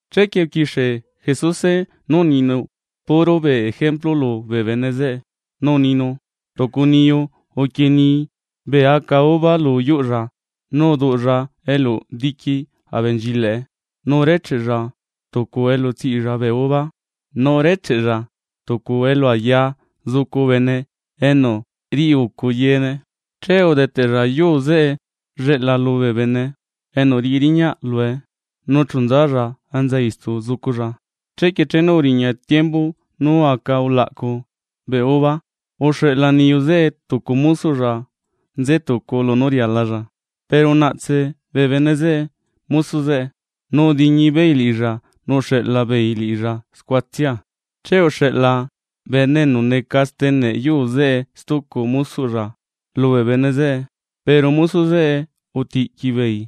Chequie uquixie Jesuse nú uninu puro bee ejemplu lubee bene zeꞌe. Nu uninu: ―Tucu niyu uquienii bee aca uva lu yuꞌlla nu uduꞌlla eluꞌ diqui abenchilaꞌe, nu urecheꞌella tucu elu tsiꞌilla bee uva, nu urecheꞌella tucu elu ayaa zucu bene enu riꞌi ucu yeene. ’Che udeteꞌlla yuu zeꞌe lleꞌla lubee bene, enu riꞌi riñaꞌ lue, nu chu nzalla enza istu zuculla. Chequie chenu uriña tiembu nú aca ulaꞌcu bee uva, uxeꞌla niyu zeꞌe tucu mosoꞌlla nze tucu lunú rialalla. Pero unaꞌtse bee bene zeꞌe mosoꞌ zeꞌe, nu udiñi beei liꞌilla nu uxeꞌla beei liꞌilla scuatsia. Che uxeꞌla bene enu neca steneꞌ yuu zeꞌe stucu mosoꞌlla lubee bene zeꞌe, pero mosoꞌ zeꞌe utiꞌqui beei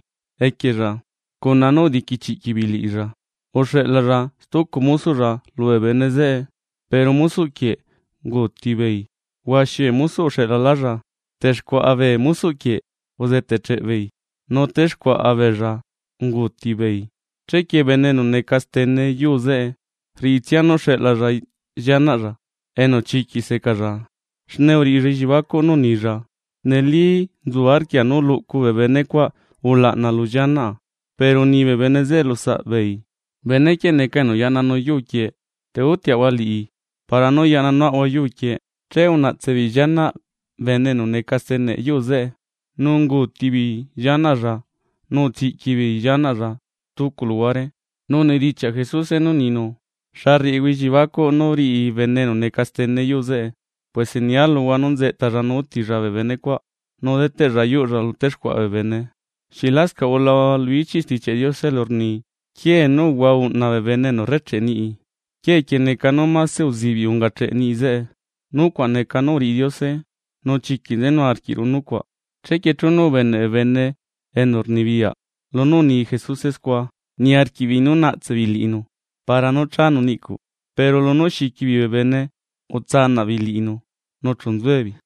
cuna nú udiquichiꞌquiꞌ beei liꞌilla. Uxeꞌlalla stucu mosoꞌlla lubee bene zeꞌe, pero mosoꞌ quieꞌ unguuti beei. Huaxi bee mosoꞌ uxeꞌlalálla, texcuaꞌa bee mosoꞌ quieꞌ uzeteꞌcheꞌ beei nu texcuaꞌa beella unguuti beei. ’Chequie bene enu neca stene yuu zeꞌe, rriꞌitsia nú xeꞌlalla llianaꞌlla, enu chiquiꞌ secaalla. Xne uriꞌilla elliebacuꞌ nú unilla: “Neli nzu arquia nú luꞌcu bee benecuaꞌ ulaꞌna lu llianaꞌa.” Pero uni bee bene zeꞌe lu saꞌbeei: “Bene quieꞌ neca enu yaꞌnanu yuu quieꞌ, té utiaꞌahua liꞌi, para nú yaꞌna nuaꞌahua yuu quieꞌ.” Che unaꞌtse beei llianaꞌ bene enu neca stene yuu zeꞌe, nu unguuti beei llianaꞌlla nu utsiꞌqui beei llianaꞌlla stucu luhuare. Nu unidichiaꞌ Jesuse nú uninu: ―¿Xa rriꞌihua elliebacuꞌ nú riꞌi bene enu neca stene yuu zeꞌe? Puese nia luhua nú nzeꞌtalla nu útilla bee benecuaꞌ nu deteꞌlla yuꞌlla lu texcuaꞌa bee bene. ’¿Xieꞌ lascaꞌ ulahua lu ichiꞌ Stichiaꞌ Diose elu rni? Quiee nú uhua uꞌna bee bene enu rrecheꞌe niꞌi, quiee quieꞌ neca nú mase uzibiꞌ ungacheꞌ niꞌi zeꞌe. Nucuaꞌ neca nú uriꞌi Diose, nu chiquiꞌ nzenu arquiꞌru nucuaꞌ. Chequie chenu ubeneꞌ bee bene enu rnibiyaꞌ lunú uni Jesuse scua, niarquiꞌbeei nú naꞌtse beei liꞌinu para nú chánu niꞌcuꞌ, pero lunú xiqui beei bee bene utsanaꞌ beei liꞌinu nu chu nzuebeei.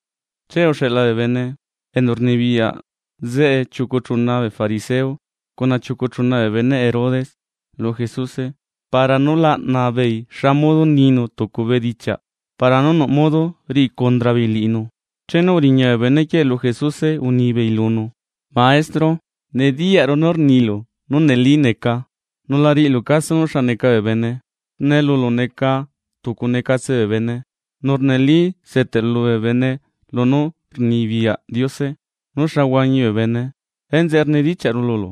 Che uxeꞌla bee bene, enu rnibiyaꞌ zeꞌe chiucu chuna bee fariseo cuna chiucu chuna bee beneꞌ Herodes lu Jesuse, para nú laꞌna beei xa modo ninu tucu bedichiaꞌ para nú nuꞌ modo riꞌi condra beei liꞌinu. Chenu uriña bee benequieꞌ lu Jesuse unibeei lunu: ―Maestro, nediyaꞌru nú rnilu nú neli neca, nu la riꞌilu caso nú xa neca bee bene, xne lulu neca tucu necatse bee bene. Nu neli seteꞌlu bee bene lunú rnibiyaꞌ Diose nú xa huañi bee bene. Enzeꞌe rnidichiaꞌru lulu.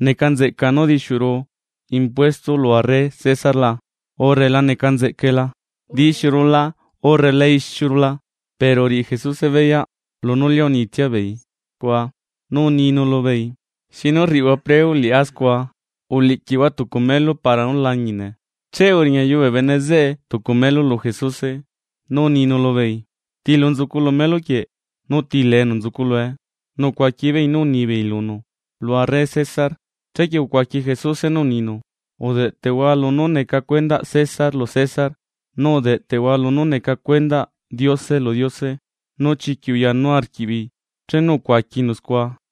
¿Neca nzeꞌca nú dixiuru impuesto lu arre César la?, urre ¿la neca nzeꞌcae la? ¿Dixiuru la urre la dixiuru la? Pero uriꞌi Jesuse beyaꞌ, lunú lia unitsia beei scua, nu uninu lubeei: ―¿Xi nú rriꞌihua preo liꞌá scua? Uliꞌquihua tucu melu para nú lañine. Che uriñayuu bee bene zeꞌe tucu melu lu Jesuse, nu uninu lubeei: ―¿Tiluu nzucu lu melu quieꞌ nu ti lee enu nzucu lue? Nu ucuaqui beei nú unibeei lunu: ―Lu arre César. Chequie ucuaqui Jesuse nú uninu: ―Udeꞌteꞌhua lunú neca cuendaꞌ César lu César, nu udeꞌteꞌhua lunú neca cuendaꞌ Diose lu Diose. Nu chiquiꞌ uyanu arquiꞌbeei chenu ucuaquinu scua.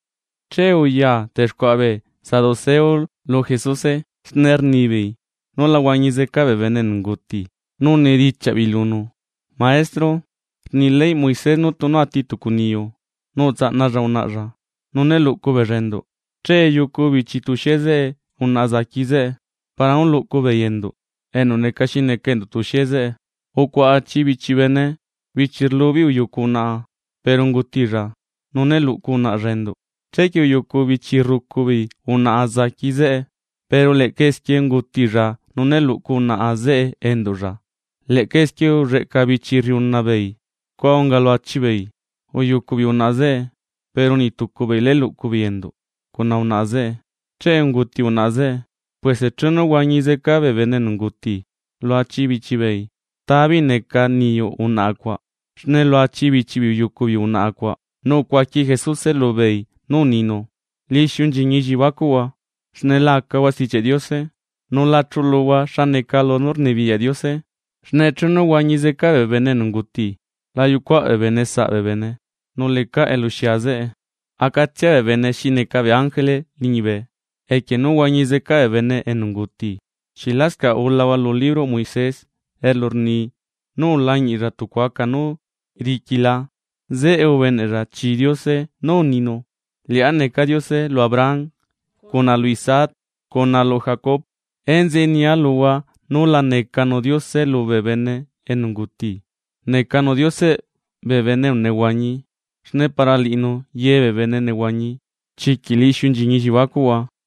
Che uya texcuaꞌa bee saduceo lu Jesuse. Xne rnibeei nú la huañi zeca bee bene enu unguti nu unidichiaꞌ beei lunu: ―Maestro, rni leyꞌ Moisés nú tunu ati tucu niyu nu utsaꞌnalla unaꞌalla nu né luꞌcu beella enduꞌ, che yucu bichi tuxie zeꞌe unaꞌa zaqui zeꞌe, para nú luꞌcu beei enduꞌ enu neca xi neca enduꞌ tuxie zeꞌe. Ucuaꞌa achi bichi bene, bichi rlu beei uyucu unaꞌa, pero ungutilla, nu né luꞌcu unaꞌlla enduꞌ. Chequie uyucu bichi rrucu beei unaꞌa zaqui zeꞌe, pero leꞌca esquie ungutilla, nu né luꞌcu unaꞌa zeꞌe enduꞌlla, leꞌca esquie ulleꞌca bichi rriuna beei. Scua unga lu achi beei, uyucu beei unaꞌa zeꞌe, pero niꞌ tucu beei né luꞌcu beei enduꞌ cuna unaꞌa zeꞌe, che unguti unaꞌa zeꞌe. Puese chenu huañi zeca bee bene enu unguti, lu achi bichi beei, ¿ta beei neca niyuꞌ unaꞌa cuaꞌ xne lu achi bichi beei uyucu beei unaꞌa cuaꞌ? Nu ucuaqui Jesuse lubeei nú uninu: ―Lixiu nchiñi elliebacuꞌhua, xne la acahua Stichiaꞌ Diose nu la chuluhua xa neca lunú rnibiyaꞌ Diose. Xne chenu huañi zeca bee bene enu unguti, la yucuaꞌ bee bene saꞌ bee bene nu lecaꞌ eluxia zeꞌe. Acatsia bee bene xi neca bee ángele liñibe. Equie nú huañi zeca bee bene enu unguti, ¿xieꞌ lascaꞌ ulahua lu libroꞌ Moisés elu rni nú ulañiꞌlla tucu aca nú riqui la? Zeꞌe ubeneꞌlla chii Diose nú uninu: “Liꞌá neca Diose, lu Abraham, cuna lu Isaac, cuna lu Jacob.” ¡Enzeꞌe nia luhua núla necanu Diose lubee bene enu unguti! Necanu Dioseꞌ bee bene enu nehuañi. Xne para liꞌinu ye bee bene nehuañi. Chiquiꞌ lixiu nchiñi elliebacuꞌhua.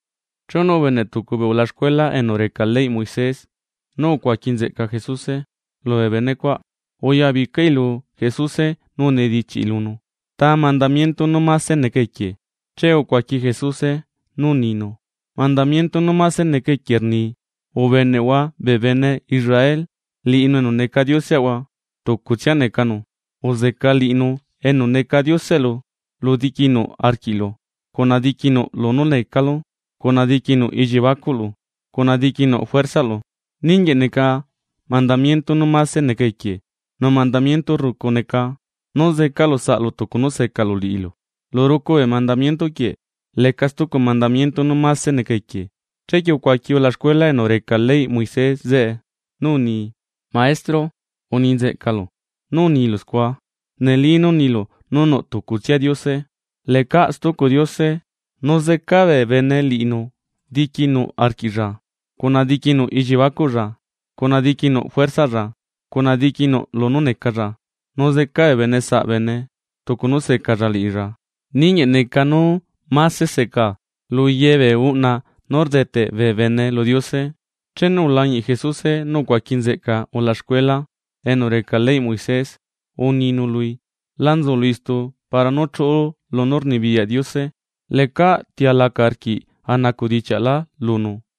Chenu ubeneꞌ tucu bee ulaxcuela enu reca leyꞌ Moisés nú ucuaqui nzeꞌca Jesuse, lubee benecuaꞌ uyabicai lu Jesuse nu unidichiaꞌi lunu: ―¿Ta mandamiento nú máse neca equie? Che ucuaqui Jesuse nú uninu: ―Mandamiento nú máse neca equie rni: “Ubeneꞌhua bee bene Israel, liꞌinu enu neca Dioseꞌahua tucutsia necanu. Uzeca liꞌinu enu neca Dioseꞌlu diquinuꞌ arquiꞌlu, cuna diquinuꞌ lunú necalu, cuna diquinuꞌ elliebacuꞌlu cuna diqui nuꞌ juerzaꞌlu.” Ninguieꞌ neca mandamiento nú máse neca equie. Nu mandamiento rrucu neca: “Zecalu saꞌlu tucu nú secalu liꞌilu.” Lu rucu bee mandamiento quieꞌ, leca stucu mandamiento nú máse neca equie. Chequie ucuaqui ulaxcuela enu reca leyꞌ Moisés zeꞌe nú uni: ―Maestro, uni nzeꞌcalu. Nú unilu scua. Neli nú unilu nú nuꞌ tucutsia Diose, lecaꞌ stucu Diose. Nu zeca bee bene liꞌinu diquinuꞌ arquiꞌlla, cuna diquinuꞌ elliebacuꞌlla cuna diquinuꞌ juerzaꞌlla, cuna diqui nuꞌ lunú necalla, nu zeca bee bene saꞌ bene tucu nú secalla liꞌilla, ninguieꞌ neca nú máse seca lu ye bee uꞌna nú rdeteꞌ bee bene lu Diose. Chenu ulañiꞌ Jesuse nú ucuaqui nzeꞌca ulaxcuela enu reca leyꞌ Moisés uninu lui: ―La nzulu istu para nú chuꞌulu lunú rnibiyaꞌ Diose. Che lecaꞌ ti alaca arquiꞌ a nacuꞌdichiaꞌlá lunu.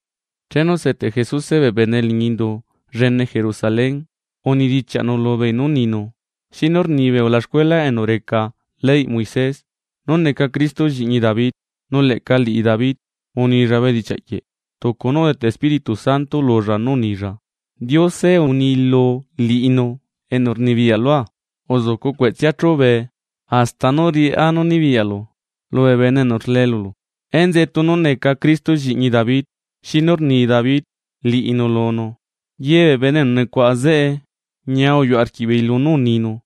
Chenu seteꞌ Jesuse bee bene liñi indu llene Jerusalén, unidichiaꞌnu lubeei nú uninu: ―¿Xinu rnibee ulaxcuela enu reca leyꞌ Moisés nú neca Cristo lliꞌñi David? Nu leꞌca liꞌi David unilla bedichiaꞌ quieꞌ, tucu nú udeteꞌ Espíritu Santo lulla nú unilla: Diose uni lu liꞌinu enu rnibiyaꞌ lua: “Uzucu cueꞌtsea chúbee, hasta nú riꞌá nú nibiyaꞌlu lubee bene enu rlee lulu.” ¿Enzeꞌe tunu neca Cristo, lliꞌñi David, xinu rni David liꞌinu lunu? Ye bee bene enu nucuaꞌa zeꞌe ñia uyuꞌ arquiꞌbeei lunú uninu.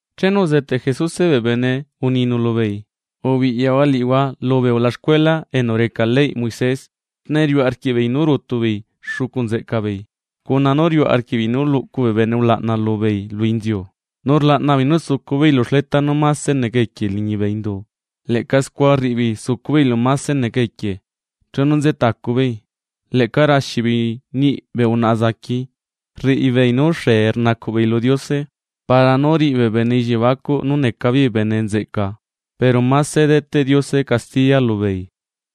Chenu uzeteꞌ Jesuse bee bene uninu lubeei: ―Ubiꞌyahua liꞌihua lubee ulaxcuela enu reca leyꞌ Moisés, xne riuꞌ arquiꞌbeei nú rutu beei xucu nzeꞌca beei, cuna nú riuꞌ arquiꞌbeei nú luꞌcu bee bene ulaꞌna lubeei lu inziu, nu rlaꞌna beei nú sucu beei lu xleta nú máse neca equie liñibe indu, leꞌca scua rriꞌi beei sucu beei elu máse neca equie chenu nze tacu beei. Leꞌca raxi beei niꞌi bee unaꞌa zaqui, rriꞌibeei nú xee rnacuꞌ beei lu Diose, para nú riꞌi bee bene elliebacuꞌ nú neca beei bene nzeꞌca pero máse deteꞌ Diose castiya lubeei.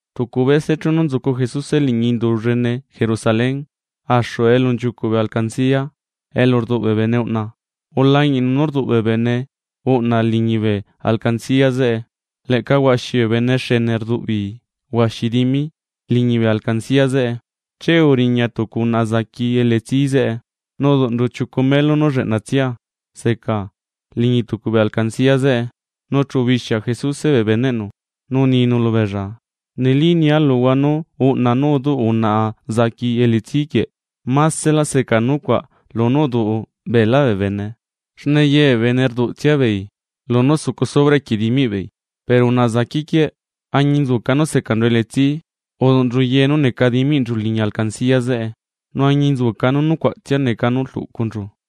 Tucu bese chenu nzucu Jesuse liñi indu llene Jerusalén axu elu nchiucuꞌ bee alcancia elu rduꞌ bee bene uꞌna, ulañiꞌnu nú rduꞌ bee bene uꞌna liñibe alcancia zeꞌe. Leꞌca huaxi bee bene xene rduꞌ beei huaxi dimi liñibe alcancia zeꞌe. Che uriña tucu unaꞌa zaqui elitsí zeꞌe, nu uduꞌnchu chiucu melu nú lleꞌnatsia seca liñi tucu bee alcancia zeꞌe. Nu chu ubixia Jesuse bee beneꞌnu, nu uninu lubeella: ―Neli nia luhua nú uꞌna nú uduꞌ unaꞌa zaqui elitsí quieꞌ maselá seca nucuaꞌ lunú uduꞌ beelá bee bene. Xne yebee bene rduꞌtsia beei lunú sucu sobra equie dimiꞌbeei, pero unaꞌa zaqui quieꞌ, añinzuca nú secanchu elitsi uduꞌnchu ye nú neca diminchu liñi alcancia zeꞌe, nu añinzuca nú nucuaꞌtsia neca nú rluꞌcunchu.